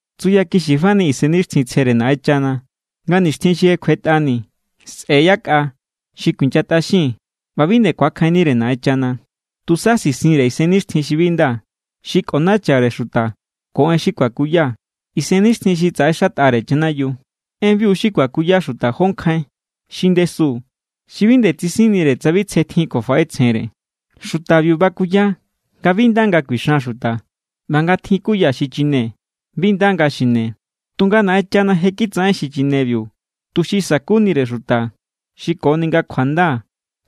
Tsuyakixi fani Isennixtjintsjere Naꞌenchana nga nixtjin xi je kjuetꞌani sꞌe̱= yakꞌa xi kuinyatꞌaxin ꞌba bi nde ku̱akjainnire Naꞌenchana. Tusa sisinre isennixtjin xi bi nda xi kꞌonachare xuta ko en xi kuakuya isennixtjin xi tsaꞌexatꞌare chanayiu. Enbiu xi kuakuya xuta jó nkjain xi ndesu xi bi nde tsisinnire tsa bi tsje tjin kjuafaꞌetsjenre. Xutabiu bakuya nga bi nda nga kuixan xuta ꞌba nga tjin kuya xichine bi nda nga xine. Tunga Naꞌenchana je kitsaꞌen xichinebiu tuxi sa̱kunire xuta xi koni nga kjuanda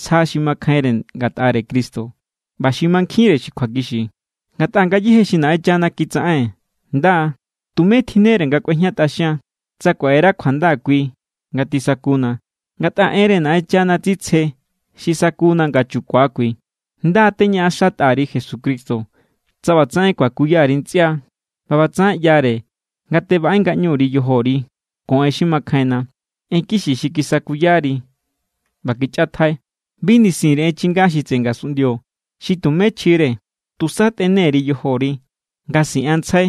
sja xi makjainre ngatꞌare Cristo ꞌba xi mankjinre xi kjuakixi. Ngatꞌa ngayéje xi Naꞌenchana kitsaꞌen nda=. Tumé tjinnere nga kꞌuejñatꞌaxian, tsa kuaꞌera kjuanda kui nga tisakuna. Ngatꞌa enre Naꞌenchana tsitsje xi sakuna nga chukua kui. Nda= teñaꞌaxatꞌa_ri Jesucristo, tsa ꞌbatsaꞌen kuakuya_ri ntsꞌia. ꞌBa ꞌbatsaꞌen ꞌyare nga tebaꞌé ngaꞌñu_ri yojori ko en xi makjainna, en kixi xi kisakuyari ꞌba kichꞌatjai. Bi nisin_ri en chinga xi tseꞌe ngasunꞌndio xi tumé chjire. Tusa tꞌene_ri yojori nga siꞌanntsjai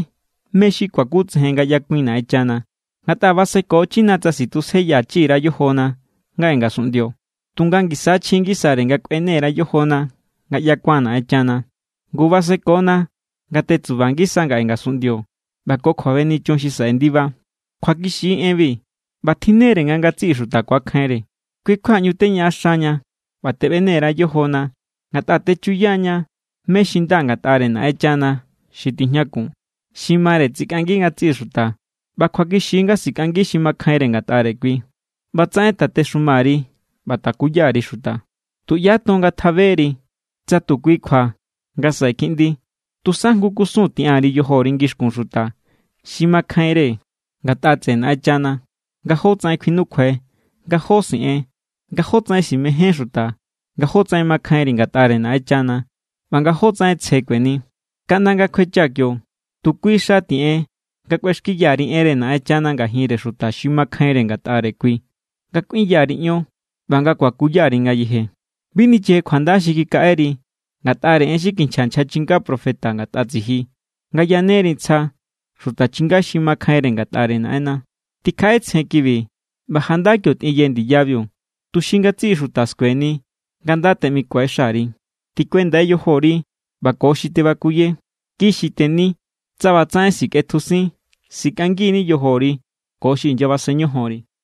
mé= xi kuakutsejen nga ꞌyakuin Naꞌenchana. Ngatꞌa basekochina tsa sitjusjeyachi_ra yojona ngaꞌe ngasunꞌndio, tunga ngisa= chji ngisare nga kꞌuene_ra yojona nga ꞌyakuan Naꞌenchana. Ngu basekona nga tetsuba ngisa ngaꞌe ngasunꞌndio ꞌba ko kjuabenichun xi saꞌe ndiba. Kjuakixi= enbi ꞌba tjinne=re nga ngatsiꞌi xuta ku̱akjainre. Kui= kjua ꞌñu teñaꞌaxaña ꞌba teꞌbene_ra yojona, ngatꞌa techuyaña mé= xi nda ngatꞌare Naꞌenchana xi tijñakun. Xi mare tsikꞌangi ngatsiꞌi xuta ꞌba kjuakixi= nga sikꞌangi xi makjainre ngatꞌare kui. ꞌBatsaꞌen tatexuma_ri ꞌba takuya_ri xuta. Tuꞌyá ton ngatjaberi tsa tu kui kjua nga̱ saꞌe kiꞌndi. Tusa jngu kusun tiꞌan_ri yojori ngixkun xuta xi makjainre ngatꞌa tseꞌe Naꞌenchana nga jótsaꞌen kjuinukjuai, nga jó siꞌen, nga jótsaꞌen simején xuta, nga jótsaꞌen mankjainri ngatꞌare Naꞌenchana, ꞌba nga jótsaꞌen tsje kueni. Kaꞌnda nga kjuechaa̱ kio, tu kui xa tiꞌen nga kꞌuexkiya_ri enre Naꞌenchana ngajinre xuta xi makjainre ngatꞌare kui, nga kꞌuinya_ri ion ꞌba nga kuakuya_ri ngayeje. Bi nicheje kjuanda xi kikaꞌeri ngatꞌare en xi kinchja nchja chinga profeta ngatꞌa tsiji, nga yaneri ntsja xuta chinga xi makjainre ngatꞌare Naꞌenna. Tikjaꞌetsjen kibi ꞌba janda kio tꞌinye ndiyabiu, tuxi ngatsiꞌi xuta skueni nga nda teꞌmikue xari. Tikuendai yojori ꞌba ko xi tebakuye. Kixi teni. Tsa ꞌbatsaꞌen sikꞌetjusin, sikꞌangi=ni yojori ko xi inyabasen ñojonri.